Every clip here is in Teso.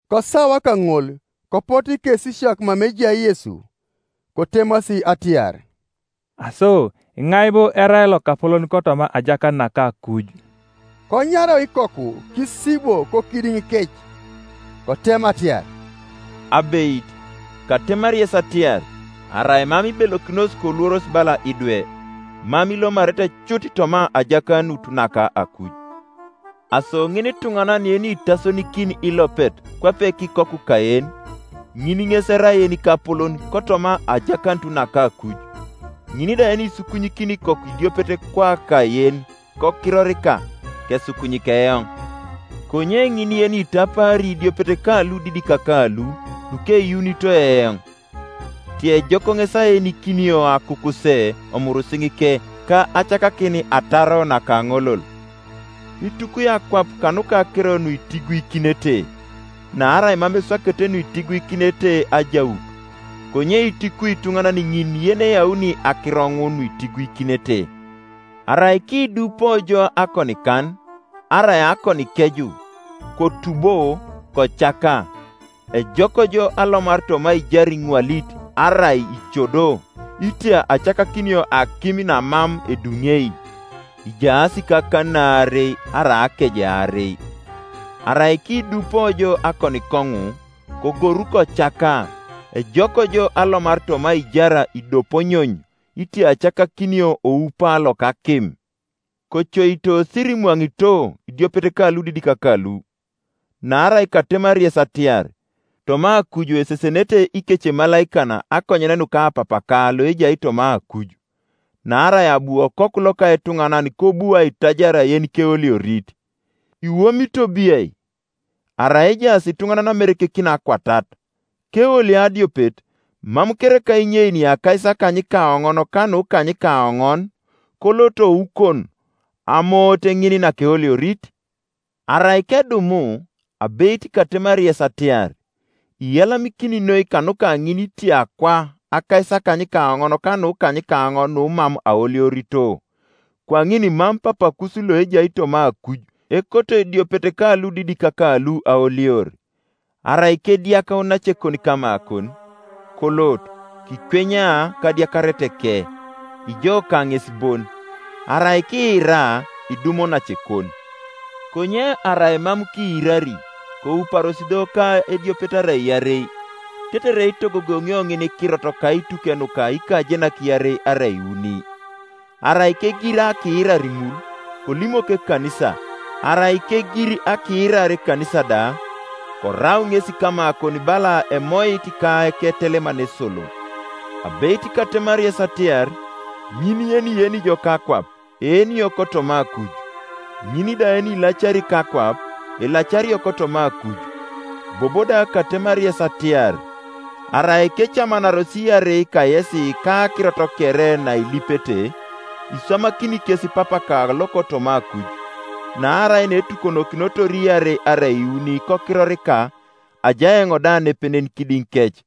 Kosawa kaŋol kopotu ikesisiak mama ejai Yesu, kotemasi atiar, “Aso iŋai bo erai lokapolon kotoma ajakanut naka akuj?” Konyarau ikoku kisibwo kokidiŋikec; kotema atiar, “Abeit, katemari yes atiar, Arai mam ibelokinos koluoros bala idwe, mam ilomarete cut toma ajakanut naka akuj. Aso ŋinituŋanan yenitasonikin ilopet kwape kikoku kayen, ŋin ŋes erai yenikapolon kotoma ajakanut naka akuj. “Ŋin da yenisukunyikini ikoku idiopet kwaka yen kokirorika, kesukunyik eoŋ; konye ŋin yenitapaari idiopet ka ludidik kalu lukeyuunito eoŋ, ti ejok ŋes aenikinio akukuse omurisiŋike ka acakakin ataro nakaŋolol. “Itukwi akwap kanuka akiro nuitiguikinete! Naarai mam eswakete nuitiguikinete ajaut, konye itukwi ituŋanan ŋin yeneyauni akiro ŋun nuitiguikinete! Arai kiidupo jo akonikan, arai akonikeju, kotubo kocaka; ejok jo alomar toma aijar iŋwalit arai icodo, itia acakakinio akim namam eduŋei, ijaas kakanin aarei arai akeje aarei. Arai kiidupo jo akonikoŋu, kogoru kocaka; ejok jo alomar toma aijar idoponyony itia acakakinio oupa loka akim. “Kocoito sirimwaŋito idiopet ka ludidik kalu; naarai katemari yes atiar, Toma akuj esesenenete ikecemalaikan akonyen nuka Papaka loejai toma akuj. [ Naarai abu Okoku loka etuŋanan kobu aitajar yenikeoliorit.] Iwomito biai? Arai ejaas ituŋanan amerekekin akwatat, keolio adiopet, mam kereka inyeini akaisakanykaoŋon ka nukanykaonon, kolot oukon amoote ŋin nakeoliorit? Arai kedumu, abeit katemari yes atiar, Iyalamikini noi kanuka ŋin itia kwa akaisakanykaoŋon ka nukanykaonon numam aoliorito, Kwaŋin mam Papakus loejai toma akuj ekoto idiopet kaludidik kalu aolior. “Arai kediak onacekon kamakon, kolot, kikwenya kadiakareteke, ijo ka ŋes bon: arai kiira, idum onacekon. Konye arai mam kiirari, kouparos do ka ediopet arai iarei, tetere itogogoŋio ŋinikirot kaituke nuka ikajenak iarei arai iuni. Arai kegir akiirar ŋul, kolimok ekanisa; arai kegir akiirar ekanisa da, korau ŋesi kamakon bala emoit ka eketeleman esolo. Abeit katemari yes atiar, ŋin yenieni ijo kakwap eenio kotoma akuj, ŋin da yenilacari kakwap elacario kotoma akuj. Bobo da katemari yes atiar, Arai kecamanaros iarei kayesi kakirot kere nailipete, iswamakini kes Papaka lokotoma akuj. Naarai neetukokinotor iarei arai iuni kokirorika, ajai eoŋ da nepenen kidiŋikec.”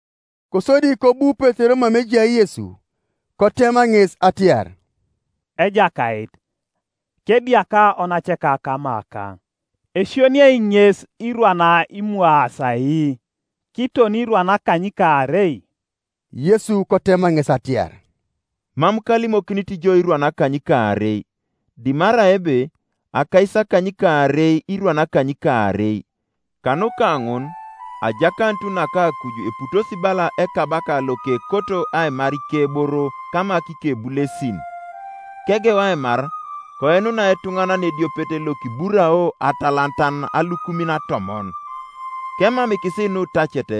Kosodi kobu Petero mama ejai Yesu, kotema ŋes atiar, “Ejakait, kediaka onaceka kamakaŋ, esioniei ŋes irwan imwaasi ai? Kiton irwan akanykaarei?” Yesu kotema ŋes atiar, “Mam kalimokinit jo irwan akanykaarei, dimarai ebe akaisakanykaarei irwan akanykaarei. “Kanuka ŋun ajakanut naka akuj eputosi bala ekabaka lokekoto aimar ikeboro kama kikebulesin. Kegeu aimar, koinunai etuŋanan ediopet Iokiburao atalantan alukumin atomon, Kemamikis nutacet,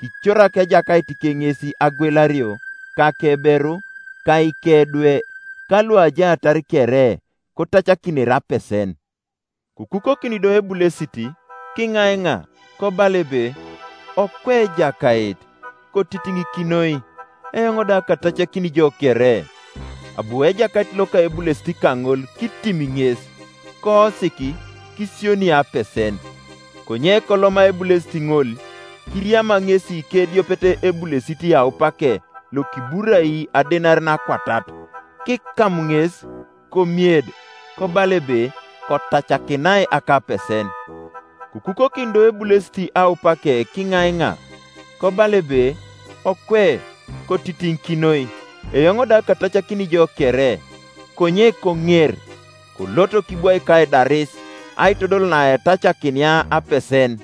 kicorak ejakaitike ŋes agwelario, ka akeberu, ka ikedwe, ka luajaatar kere, kotacakinere apesen. Kokukokin do ebulesit, kiŋaiŋa, kobala ebe, ‘Okwe Ejakait, kotitiŋikinoi, eoŋ da katacakini jo kere.’ Abu ejakait loka ebulesit kaŋol kitim ŋes, koosik, kisioni apesen. Konye koloma ebulesit ŋol, kiriama ŋesi kediopet ebulesit aupake lokiburai adenarin akwatat; kikam ŋes, komied, kobala ebe, ‘Kotacakinai akapesen.’ Kokukokin do ebulesit aupake kiŋaiŋa, kobala ebe, ‘Okwe, kotitiŋikinoi, eoŋ da katacakini jo kere.’ Konye koŋer, kolot kibwaik aidaris aitodol naetacakinia apesen.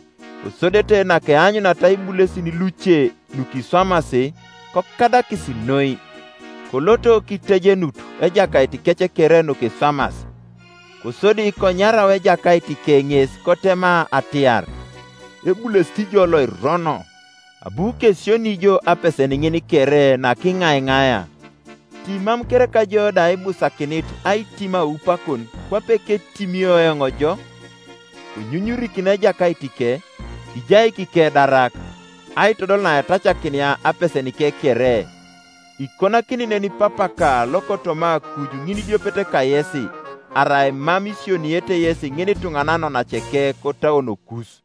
Kosodete nakeanyuniata ibulesin luce nukiswamas, kokadakis noi, koloto kitejenut ejakaitikec kere nukiswamas. Kosodi konyarau ejakaitike ŋes kotema atiar, ‘Ebulesit ijo loirono! Abu kesioni jo apesen ŋin kere nakiŋaiŋaia; ti mam kereka jo da ibusakinit aitim aupakon, kwape ketimio eoŋ jo?’ Konyunyurikin ejakaitike, kijaik ikedarak, aitodol naetacakinia apesenike kere. Ikonakini nen Papaka lokotoma akuj ŋinidiopet kayesi, arai mam isioniete yesi ŋinituŋanan onaceke kotauonokus.”